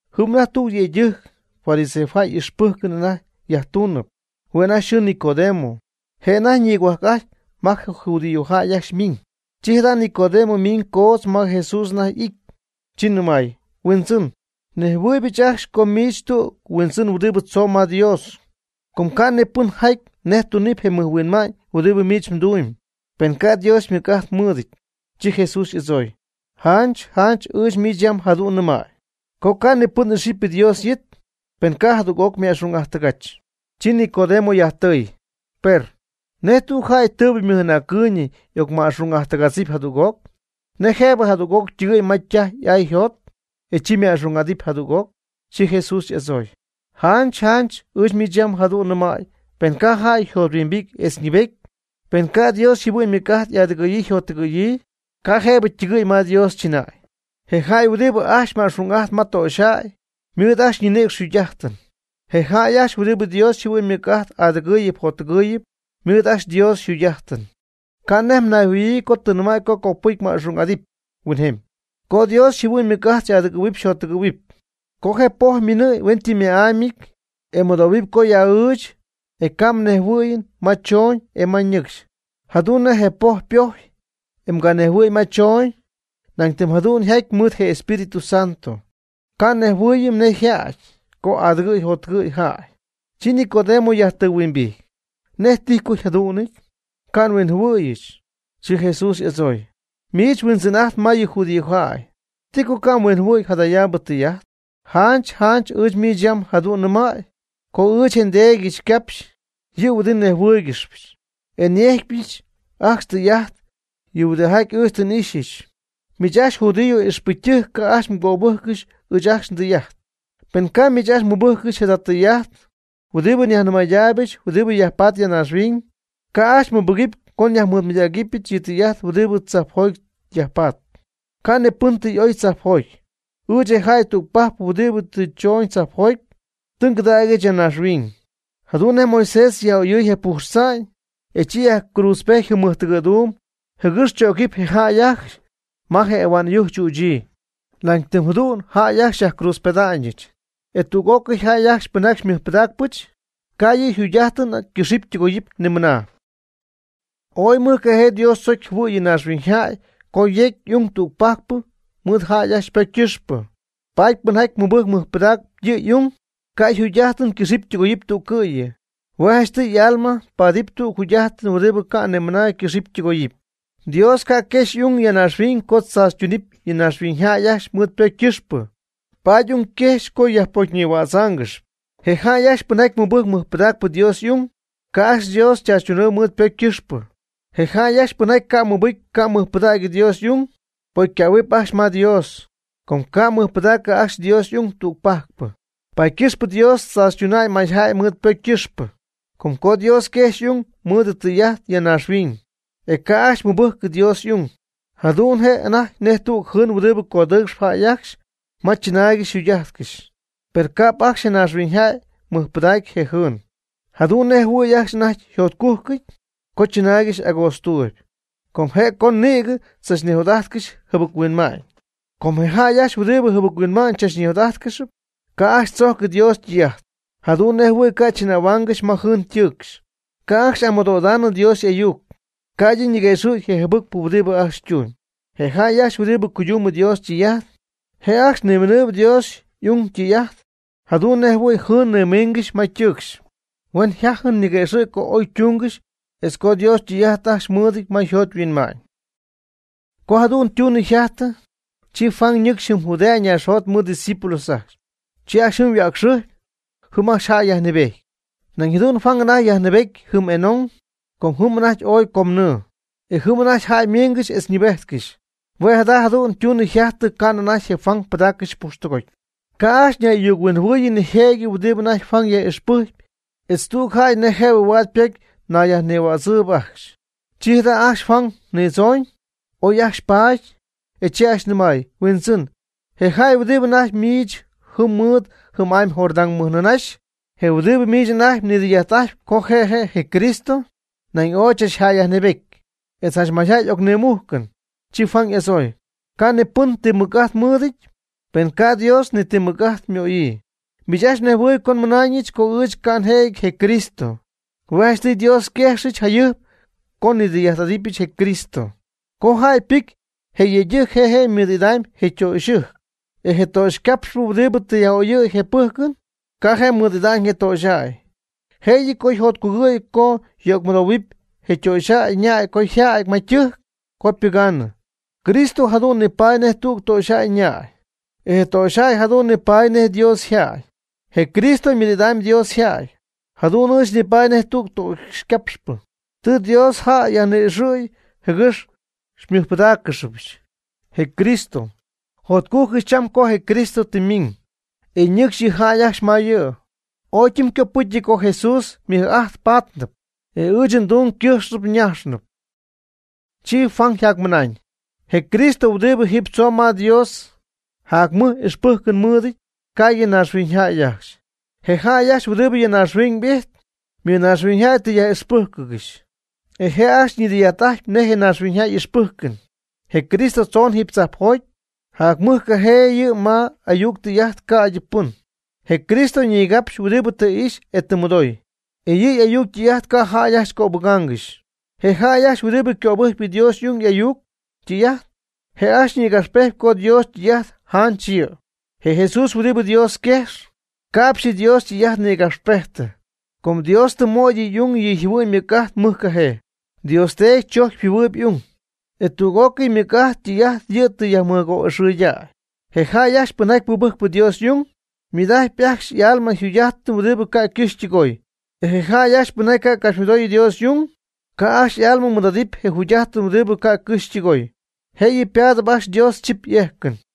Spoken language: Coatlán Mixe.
Jɨm anajty tüg yëydɨjc, fariseojäy y'ixpɨjcɨn anajty yajtuunɨpy. Hue' anajty yxɨɨ Nicodemo. Je' anajty ñigohuajc'ajtyp ma je judíojäy ajcxy ymiiñ. Chi jada' Nicodemo ymiñ coodz ma Jesús anajty y'ity, chi nɨmay: ―Huindzɨn, nejhuɨɨyb ɨɨch ajcxy co miich tüg huindzɨn huɨdibɨ tzomb ma Dios. Com ca' ni pɨn jaty nej tunɨpy je mɨjhuinma'ñ huɨdibɨ miich mdumyb, pen ca' Dios ymɨc'ajt mɨɨdɨty. Chi Jesús y'adzooy: ―Janch janch ɨɨch miich yam jadu'n nɨmäy, co ca' ni pɨn ixɨpy Dios y'it, pen ca' jadüg'oc yma'xung'ajttɨgach. Chi Nicodemo yajtɨy: ―Per, ¿nej tüg jäy tɨɨbɨ ymɨj'anäccɨɨyñɨ y'ocnima'xung'ajttɨgájtzpɨty jadüg'oc? ¿Nej jëbɨ jadüg'oc ytɨgɨ̈y ma ytaj y'aa yjot, e chi yma'xung'adɨty jadüg'oc? Chi Jesús y'adzooy: ―Janch janch ɨɨch miich yam jadu'n nɨmäy pen ca' jäy yjothuimbity etz ñɨɨbety, pen ca' Dios yjɨhuɨ'ñ ymɨc'ajt y'adɨgɨ̈yii yjottɨgɨ̈yii, ca' jëbɨ ytɨgɨ̈y ma Dios chɨnäy. Je jäy huɨdibɨ ajcxy ma'xung'ajtp ma töxyjäy, ymɨɨd ajcxy ñinïcx yjugy'ajtɨn. Je jäy ajcxy huɨdibɨ Dios yjɨhuɨ'ñ ymɨc'ajt adɨgɨɨyɨpy jottɨgɨɨyɨpy ymɨɨd ajcxy Dios yjugy'ajtɨn. Ca' nej mnayjɨhuɨ̈huɨɨyb co tɨ nnɨmäy co copɨcy mma'xung'adɨpy huinjemy, co Dios yjɨhuɨ'ñ ymɨc'ajt xy'adɨgɨ̈huɨpy xyjottɨgɨ̈huɨpy. Com je poj miinɨɨyb hueñytɨmyma'amyɨty, e nmɨdoohuɨm co y'a'ɨɨch, e ca' nnejhuɨɨyɨm ma choñ e ma ñɨcxy. Jadu'n nej je poj ypojy e nganejhuɨɨyɨm ma choñ, nañ tɨm jadu'n yjaty mɨɨd je Espíritu Santo, ca' nejhuɨɨyɨm nej yjaty co adɨgɨ̈y jottɨgɨ̈y jäy. Chi Nicodemo yajtɨhuimbijty: ―¿Nej tijy co yjadu'nɨty? Ca' nhuinjɨhuɨ̈yɨch. Chi Jesús y'adzooy: ―Miich huindzɨn'ajtp ma yɨ judíojäy, ¿ti co ca' mhuinjɨhuɨ̈y jadayaabɨ tɨy'ajt? Janch janch ɨɨch miich yam jadu'n nnɨmäy co ɨɨch etz nDeedɨch ngapxyp yɨ huɨdibɨ nejhuɨ́ɨygɨxypɨch, e nyejcpyɨch ajcxy tɨy'ajt yɨ huɨdijaty ɨɨch tɨ n'íjxcɨxyɨch. Miich ajcxy judío ixpɨcytɨjc ca' ajcxy mgöbɨjccɨxy ɨɨch ajcxy ndɨy'ajt. Pen ca' miich ajcxy mɨbɨjccɨxy jada tɨy'ajt huɨdibɨ njanimɨydacypɨch huɨdibɨ yajpatp ya naaxhuiñ, ca' ajcxy mmɨbɨgɨpy co njanimɨydägɨbɨch yɨ tɨy'ajt huɨdibɨ tzajpjoty yajpatp. Ca' ni pɨn tɨ y'oy tzajpjoty, ɨɨch je jäy tügpajc huɨdibɨ tɨ ndzoñɨch tzajpjoty, tɨ ngɨdägyɨch ya naaxhuiñ. Jadu'n nej Moisés yaj'oyɨy je pujx tza'ñ, e chi yajcruudzpety jɨm mɨjtɨgɨ̈duum jɨgɨx chögɨpy je jäy ajcxy ma je ahua'n ɨyujc chüchyii. Nañ tɨm jadu'n jäy ajcxy xyajcruudzpeda'ñɨch. E tüg'ócɨy jäy ajcxy pɨnjaty xymɨjpɨdaacpɨch, ca' yɨ' jugy'ajtɨn ycɨxy ytɨgooy ni mɨna. Ooy mɨjcajee Dios tzocy jɨhuɨ̈y yɨ naaxhuiñyjäy co yecy y'ung tügpajcpɨ mɨɨd jäy ajcxy ypocy ycɨxpɨ. Paady pɨnjaty mɨbɨjcp mɨjpɨdacp yɨ' y'ung, ca' yjugy'ajtɨn ycɨxɨpy ytɨgoyɨpy tüccɨ'yɨ. Hue' janchtɨy y'alma ypaadɨpy tüg jugy'ajtɨn huɨdibɨ ca' ni mɨna ycɨxɨpy ytɨgoyɨpy. Dios ca' quejxy y'ung ya naaxhuiñ co tzaachytunɨpy yɨ naaxhuiñyjäy ajcxy mɨɨd ypocy ycɨxpɨ. Paady y'ung quejxy co yajpocyñïhuáatzcɨxɨpy. Je jäy ajcxy pɨnjaty mɨbɨjcp mɨjpɨdacp Dios y'ung, ca' ajcxy Dios chaachytunɨpy mɨɨd ypocy ycɨxpɨ. Je jäy ajcxy pɨnjaty ca' mɨbɨcy ca' mɨjpɨdägy Dios y'ung, pocycähuɨpy ajcxy ma Dios, co ca' mɨjpɨdacɨ ajcxy Dios y'ung tügpajcpɨ. Paady ycɨxpɨ Dios tzaachytuna'ñ mayjäy mɨɨd ypocy ycɨxpɨ, com co Dios quejxy y'ung mɨɨd ytɨy'ajt ya naaxhuiñ, e ca' ajcxy mɨbɨjcy Dios y'ung, jadu'n je' anajty nej tüg jɨɨn huɨdi codɨɨcxɨp jäy ajcxy ma chɨnaayɨn yjugy'ajtɨn. Per ca'p ajcxy je naaxhuiñyjäy mɨjpɨdacy je jɨɨn, jadu'n nej jɨhuɨ̈y ajcxy anajty yjacjotcujcɨty co chɨnaaygɨxy agoodztuuyb, com je' co nïgɨ tzachnijot'ajtcɨxy jɨbɨc-huinma'ñ. Com je jäy ajcxy huɨdibɨ jɨbɨc-huinma'ñ tzach nijot'ajtcɨxp, ca' ajcxy tzojcɨ Dios ytɨy'ajt, jadu'n nej jɨhuɨ̈y ca' chɨnähuaangɨxy ma jɨɨn ytɨɨcxɨn. Ca' ajcxy y'amɨdoo'idanɨ Dios y'ayuc, ca'ydɨ ñiguëxɨ̈gy je jɨbɨcpɨ huɨdibɨ ajcxy ytumyb. Je jäy ajcxy huɨdibɨ cuydumb Dios ytɨy'ajt, je' ajcxy ñiminɨpy Dios y'ung ytɨy'ajt, jadu'n nej jɨhuɨ̈y jɨɨn nimiingɨxy ma ytɨɨcxy, huen jatyɨmy niguëxɨ̈gy co oy ytungɨxy etz co Dios ytɨy'ajt ajcxy mɨɨdɨty ma yjot yhuinma'ñ. Co jadu'n ytunɨ yjajtɨ, chi Jesús ñɨcxy jɨm Judea naaxjot mɨɨd ydiscípulos ajcxy. Chi ajcxy jɨm yhuäcxɨjpy. Jɨm ajcxy jäy yajnɨɨbejty. Nañ jadu'n Juan anajty yjäyyajnɨɨbety jɨm Enón, com jɨm anajty ooy comnɨɨ, e jɨm anajty jäy ymingɨxy etz ñɨɨbejtcɨxy. Hue' jada jadu'n ytunɨ yjajtɨ ca'nɨ anajty je Juan pɨdaaccɨxy pujxtɨgoty. Ca' ajcxy ñay'ayuc-huinjɨhuɨɨyɨ nijëjɨty huɨdibɨ anajty Juan yaj'ixpɨjcyp etz tüg jäy nej jëbɨ huaad ypocy ñayyajnïhuädzɨɨyb ajcxy. Chi jada' ajcxy Juan nidzooñ, oy ajcxy paty, e chi ajcxy nɨmay: ―Huindzɨn, je jäy huɨdibɨ anajty miich jɨm mɨɨd jɨm'amy Jordán mɨjnɨɨnaxy, je huɨdibɨ miich anajty mnidɨy'ajt'ajtpy co je' je' je Cristo, nañ ooy chachjäyyajnɨɨbety. E janch mayjäy y'ocnimujcɨn. Chi Juan y'adzooy: ―Ca' ni pɨn ni ti mɨc'ajt mɨɨdɨty, pen ca' Dios ni ti mɨc'ajt ymöyii. Miich ajcxy mnejhuɨɨyb co nmɨnaañɨch co ɨɨch ca' njëjɨty je Cristo. Hue' janchtɨy Dios xyquejxɨch jayɨjp co nnidɨy'ajt'adɨpyɨch je Cristo. Co jäy ypɨcy je yëydɨjc je' je' mɨɨd'idam je ytöxyɨjc. E je töxycapxpɨ huɨdibɨ tɨ yaj'oyɨ̈y je pɨjcɨn, ca' je' mɨɨd'ida'ñ je töxyjäy, jëyɨ co yjotcugɨ̈y co yöcmɨdoohuɨ je töxyjäy ñäy co yjädy ma je' ytɨjc co ypɨgaanɨ. Cristo jadu'n je' nipaady nej tüg töxyjäy ñäy, e je töxyjäy jadu'n je' nipaady nej Dios yjäy. Je Cristo ymɨɨd'idaanɨpy Dios yjäy. Jadu'n ɨɨch nipaady nej tüg töxycapxpɨ, tɨ Dios yjäy nyajni'ixɨɨyɨch jɨgɨx mɨjpɨdáaccɨxɨpy je Cristo. Jotcujcɨch cham co je Cristo tɨ ymiñ, e ñɨcxy yɨ jäy ajcxy ma yɨ'. Ooy ytɨmycopɨcyɨty co Jesús ymɨj'ajt paatnɨpy, e ɨɨch ndung ycɨjxnɨpy ymayñɨpy. Chi Juan yjacmɨnañ: ―Je Cristo huɨdibɨ jiiby tzoon ma Dios jacmɨj ixpɨjcɨn mɨɨdɨty ca'ydɨ naaxhuiñyjäy ajcxy. Je jäy ajcxy huɨdibɨ ya naaxhuiñ ijtp, ymɨnaaxhuiñyjäy tɨ yaj'ixpɨ́jcɨgɨxy, e je' ajcxy ñidɨy'ajt'ajtpy je naaxhuiñyjäy y'ixpɨjcɨn. Je Cristo tzoon jiiby tzajpjoty, jacmɨjcajee yɨ' ma y'ayuc ytɨy'ajt ca'dyɨ pɨn. Je Cristo ñigapxyp huɨdibɨ tɨ ixy e tɨ mɨdooy, e yɨ'y'ayuc ytɨy'ajt ca' jäy ajcxy cöbɨgaangɨxy. Je jäy ajcxy huɨdibɨ cöbɨjcp Dios y'ung y'ayuc ytɨy'ajt, je' ajcxy nïgapxpejtyp co Dios ytɨy'ajt janch yɨ'. Je Jesús huɨdibɨ Dios yquejx, ca'pxy Dios ytɨy'ajt nïgapxpejtɨ, com Dios tɨ möy yɨ' y'ung yɨ' yjɨhuɨ'ñ ymɨcc'ajt mɨjcajee. Dios Teedy chojcyp yjɨhuɨɨyb y'ung, e tüg'ócɨy ymɨc'ajt ytɨy'ajt yɨ'tɨ yajmɨgo'ixɨɨydäy. Je jäy ajcxy pɨnjaty mɨbɨjcp Dios y'ung, ymɨɨd'ajtpy ajcxy y'alma je jugy'ajtɨn huɨdibɨ ca' ycɨxy ytɨgooy. Je jäy ajcxy pɨnjaty ca' capxymɨdooy Dios y'ung, ca' ajcxy y'alma mɨɨd'adɨpy je jugy'ajtɨn huɨdibɨ ca' ycɨxy ytɨgooy. Je'yɨ ypaadɨpy ajcxy Dios chip y'ejcɨn.